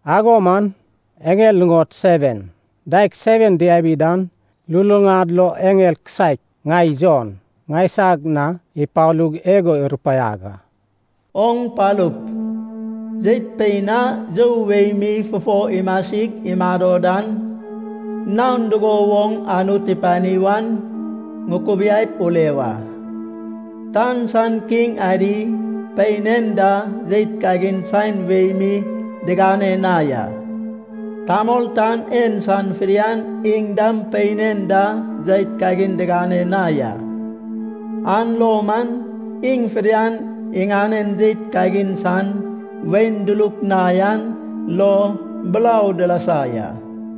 Ago man eŋel nuŋod seven daeg seven diabi dan luluŋad lo eŋel kisaek ŋai Jon ŋaisag na ipalug igo irupaiag a. “Oŋ palup, jeit pein a you wei mi fufo imasig imado dan, naon dugo woŋ Anut ipani wan ŋukubiaip ule wa. Tan san kiŋ adi pein en da jeit kagin saen wei mi digane na ya. Tamol tan en san fidian iŋ dam pein en da jeit kagin digane na ya. An lo man iŋ fidian iŋanen jeit kagin san wain duluk na yan lo burau dilasa ya.”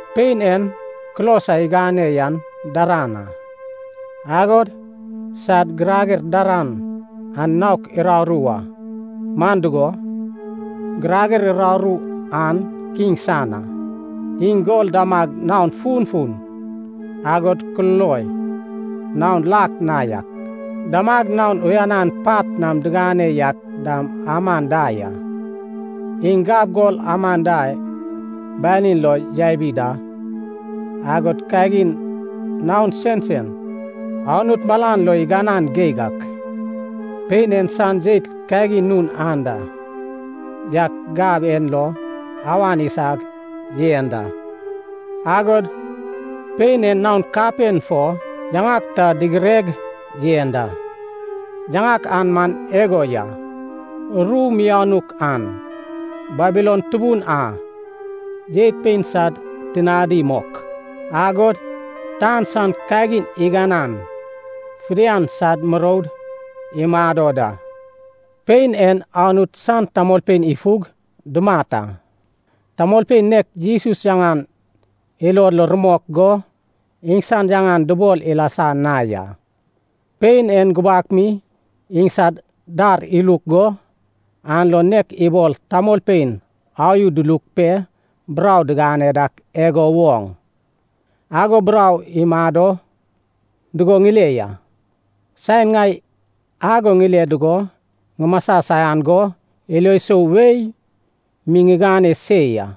Pein en kulos a igane yan daran a, agod sad girager daran an naok uraru a, man dugo, girager uraru an kiŋ san a. Iŋ gol damag naon funfun, agod kululoi naon lak na yak, damag naon uyanan pat nam digane yak dam aman da ya. Iŋ gab gol aman da banin lo yabi da. Agod kagin naon sensen Anut malan lo iganan geig ak, pein en san jeit kagin nun anda yak gab en lo awan isag yen da. Agod pein en naon kapen fo yaŋak ta digireg yen da. Yaŋak an man igo ya. Ru mianuk an. Babilon tubun a. Jeit pein sad tinadi mok. Agod tan san kagin iganan fidian sad muroud imado da. Pein en Anut san tamolpein ifug dumat a, tamolpein nek Jesus yaŋan ilod lo rumok go, iŋsan yaŋan dubol ilasa na ya. Pein en gubak mi iŋsad dar iluk go, an lo nek ibol tamolpein ayu duluk pe burau digane dak igo woŋ, ago burau imado dugo ŋile ya. Saen ŋai ago ŋile dugo ŋumasa saian go ilo sou wei mi ŋigane se ya.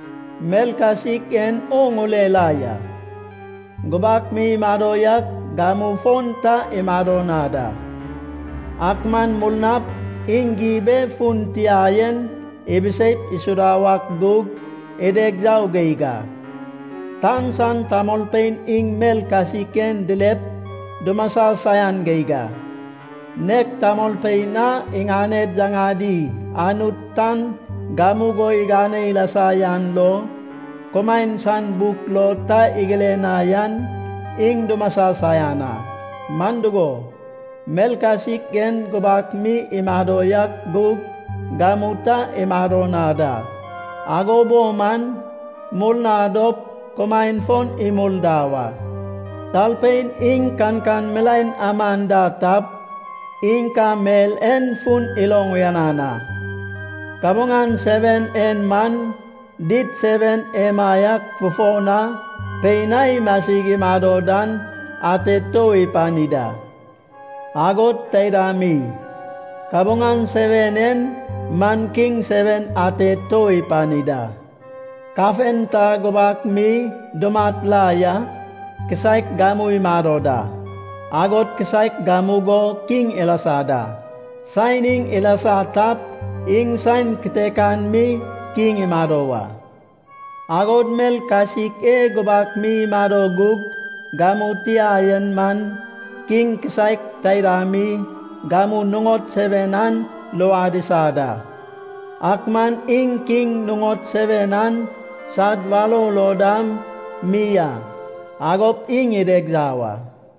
Mel kasik en oŋ ule la ya, gubak mi imado yak, gamu fon ta imado na da. Ak man murnap iŋ gib e fun tia yen ibiseip isuda wak gug, ideg yau geig a. Tan san tamolpein iŋ mel kasik en dilep dumasa saian geig a. Nek tamolpein a iŋaned yaŋadi Anut tan gamugo igane ilasa yan lo, kumaen san buk lo ta igire na yan, iŋ dumasa saian a. Man dugo, mel kasik en gubak mi imado yak gug, gamu ta imado na da, ago bo man murna dop kumaen fon imul da wa.” “Talpein iŋ kankan milaen aman da tap, iŋ ka mel en fun iloŋ uyanan a. Kabuŋan seven en man, did seven emaiak fufo na pein a imasig imado dan ate tou ipani da. Agod taida mi, kabuŋan seven en man kiŋ seven ate tou ipani da. Kafen ta gubak mi dumat la ya. Kisaek gamu imado da. Agod kisaek gamugo kiŋ ilasa da. Saen iŋ ilasa tap, iŋ saen kitekan mi kiŋ imado wa. Agod mel kasik e gubak mi imado gug gamu tia yen man, kiŋ kisaek taida mi, gamu nuŋod seven an luad isa da, ak man iŋ kiŋ nuŋod seven an sad warou lo dam mi a. Agop iŋ ideg yau a.”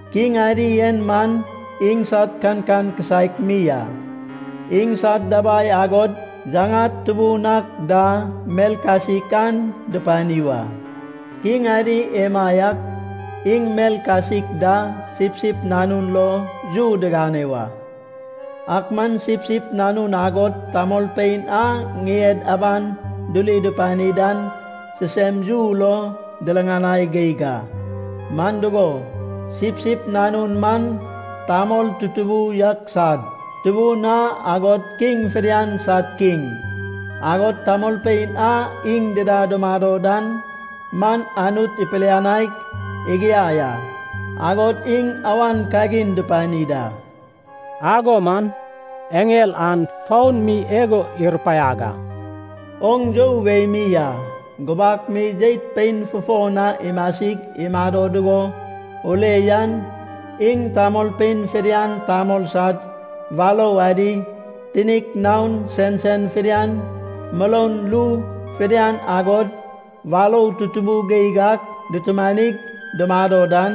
Kiŋ adi en man iŋsad kankan kisaek mi a. Iŋsad dabai agod yaŋad tubun ak da mel kasik an dupani wa. Kiŋ adi emaiak iŋ mel kasik da Sipsip Nanun lo yu digane wa. Ak man Sipsip Nanun agod tamolpein a ŋien aban duri dupani dan sisem yu lo diriŋanai geig a. Man dugo, Sipsip Nanun man tamol tutubu yak sad Tubun a, agod kiŋ fidian sad Kiŋ, agod tamolpein a iŋ dida dumado dan man, Anut ipilianaig igiai a, agod iŋ awan kagin dupani da.” Ago man eŋel an foun mi igo irupaiag a, “Oŋ you wei mi a gubak mi jeit pein fufo na imasig imado dugo ule yan, iŋ tamolpein fidian tamol sad warou adi, tinik naon sensen fidian, muroun ru fidian agod warou tutubu geig ak dutumanig dumado dan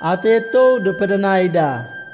ate tou dupidinai da.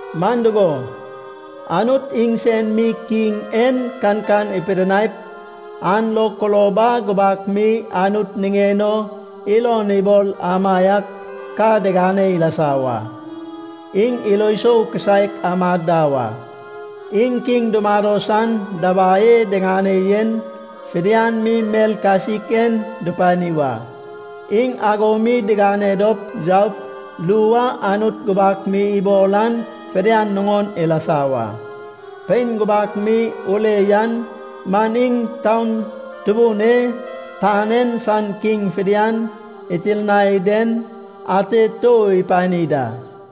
Man dugo, Anut iŋsen mi kiŋ en kankan ipidinaip, an lo kulob a gubak mi Anut niŋen o ilon ibol amaiak ka digane ilasa wa. Iŋ ilo sou kisaek amad da wa. Iŋ kiŋ dumado san dabai e diŋane yen, fidian mi mel kasik en dupani wa. Iŋ ago mi digane dop yaup ru a Anut gubak mi ibol an fidian nuŋon ilasa wa. Pein gubak mi ule yan man, iŋ taun tubun e tan en san kiŋ fidian itirnai den ate tou ipani da.”